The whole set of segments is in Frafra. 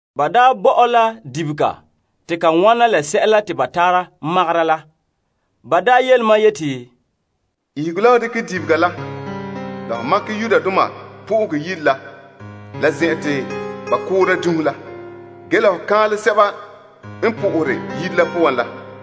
Ba bo mam la dibega te ka wɔna la sɛla te ba tara makera la ge yele mam yeti, Ihege la ho dekɛ dibega la, la ho makɛ Yenɛ Yire la kaanbegɔ la zen'en la. Ge la ho kaanlɛ sɛba n sohore Yire la poan la.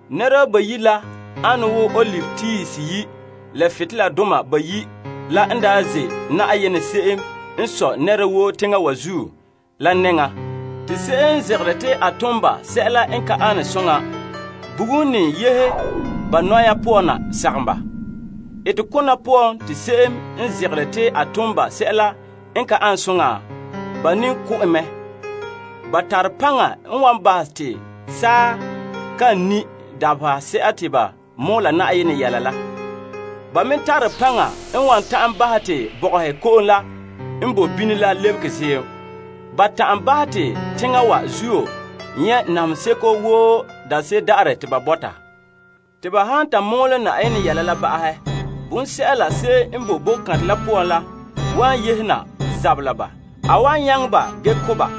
Nɛreba bayi' la ane wo kaam tiihe seyi' la butoleladoma bayi' la n ze' Na'ayenɛ se'em n sɔe nɛra woo teŋa wa zuo la nɛŋan. Te se'em n zegere te a tom ba sɛla n ka ane soŋa bugum ne yehe ba nɔya poan na sagom ba. Etekona poan te se'em n zegere te a tom ba sɛla n ka ane soŋa, ba ne ko' en mɛ. Ba tare paŋa n wan bahɛ te saa kan ni' dabahese'a te ba mɔɔla Yenɛ yelehom la. Ba me tare paŋa n wan ta'an bahɛ te bɔgɔhe ko'om la n bo bini la lebege ziim. Ba ta'an bahɛ te teŋa wa zuo nyɛ' namehe seko woo daanse'ere daarɛ te ba bɔta. Te ba han ta mɔɔlɛ Yenɛ yelehom la ba'ahɛ, bonsɛla se'em n boe boko kantɛ la poan la wan yehena zabɛ la ba. A wan nyaŋɛ ba ge ko' ba.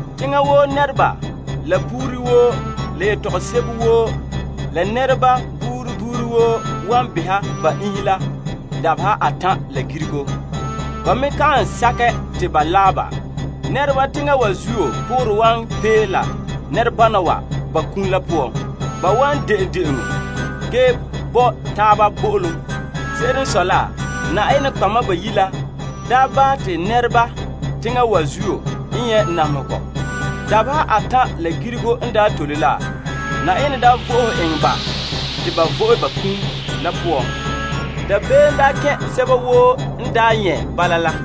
Teŋa woo nɛreba, la buuri woo, la yetɔgom sebo woo, la nɛreba yema yema wan beha ba iinhe la dabeha atan' la girigo. Ba me kan sakɛ te ba laɛ ba. Nɛreba teŋa wa zuo poorɛ wan pee la nɛrebana wa ba kum la poan. Ba wan de'en de'enɔ ge bo taaba bo'olom. Se'ere n sɔe la, nɔtɔgɔheba bayi' la daa bahɛ te nɛreba teŋa wa zuo n nyɛ' namehegɔ. Dabeha atan' la girigo n daa tole la, Yenɛ daa vo'ohe eŋɛ ba te ba vo'e ba kum la poan. Dabeem daa kɛn' sɛba woo n daa nyɛ' bala.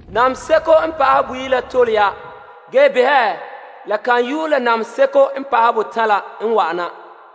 Namehe seko n pa'ahɛ boyi' la tole ya. Ge behɛ, la kan yue la namehe seko n pa'ahɛ botan' la n wa'ana.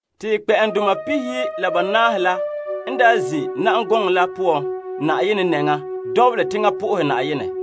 Te kpɛ'ɛndoma pihiyi' la banaahe la n zin' na'am gɔŋɔ la poan Yenɛ nɛŋan lu teŋa na'aha Yenɛ.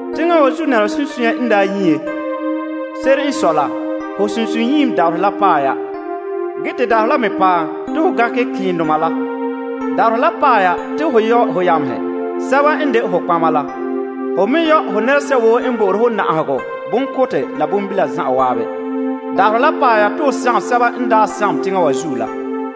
Teŋa wa zuo nɛreba sunsunya n daa nyie la, ho sunsunyiim dabaherɛ la paɛ la. Ge te dabaherɛ la me paɛ te ho gankɛ ke'endoma la. Dabaherɛ la paɛ ya te ho yɔ ho yamehe, sɛba n de ho nɔtɔgɔheba la. Ho me yɔ ho nɛresɛba woo n na'ahere ho, bonkora la bonbibihe zan'an. Dabaherɛ la paɛ ya te ho sagom sɛba n daa sagom teŋa wa zuo la.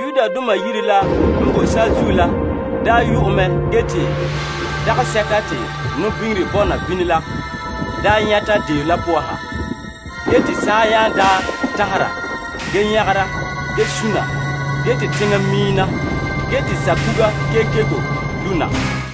Te Yenɛ Yire la n boe saazuo la daa yu'ɛ mɛ te nɔbiŋere daka la nyɛta na, ge saa daa tanhera, ge nyagera, ge suna, te teŋa miim na, te saakuga kekeko lu' na.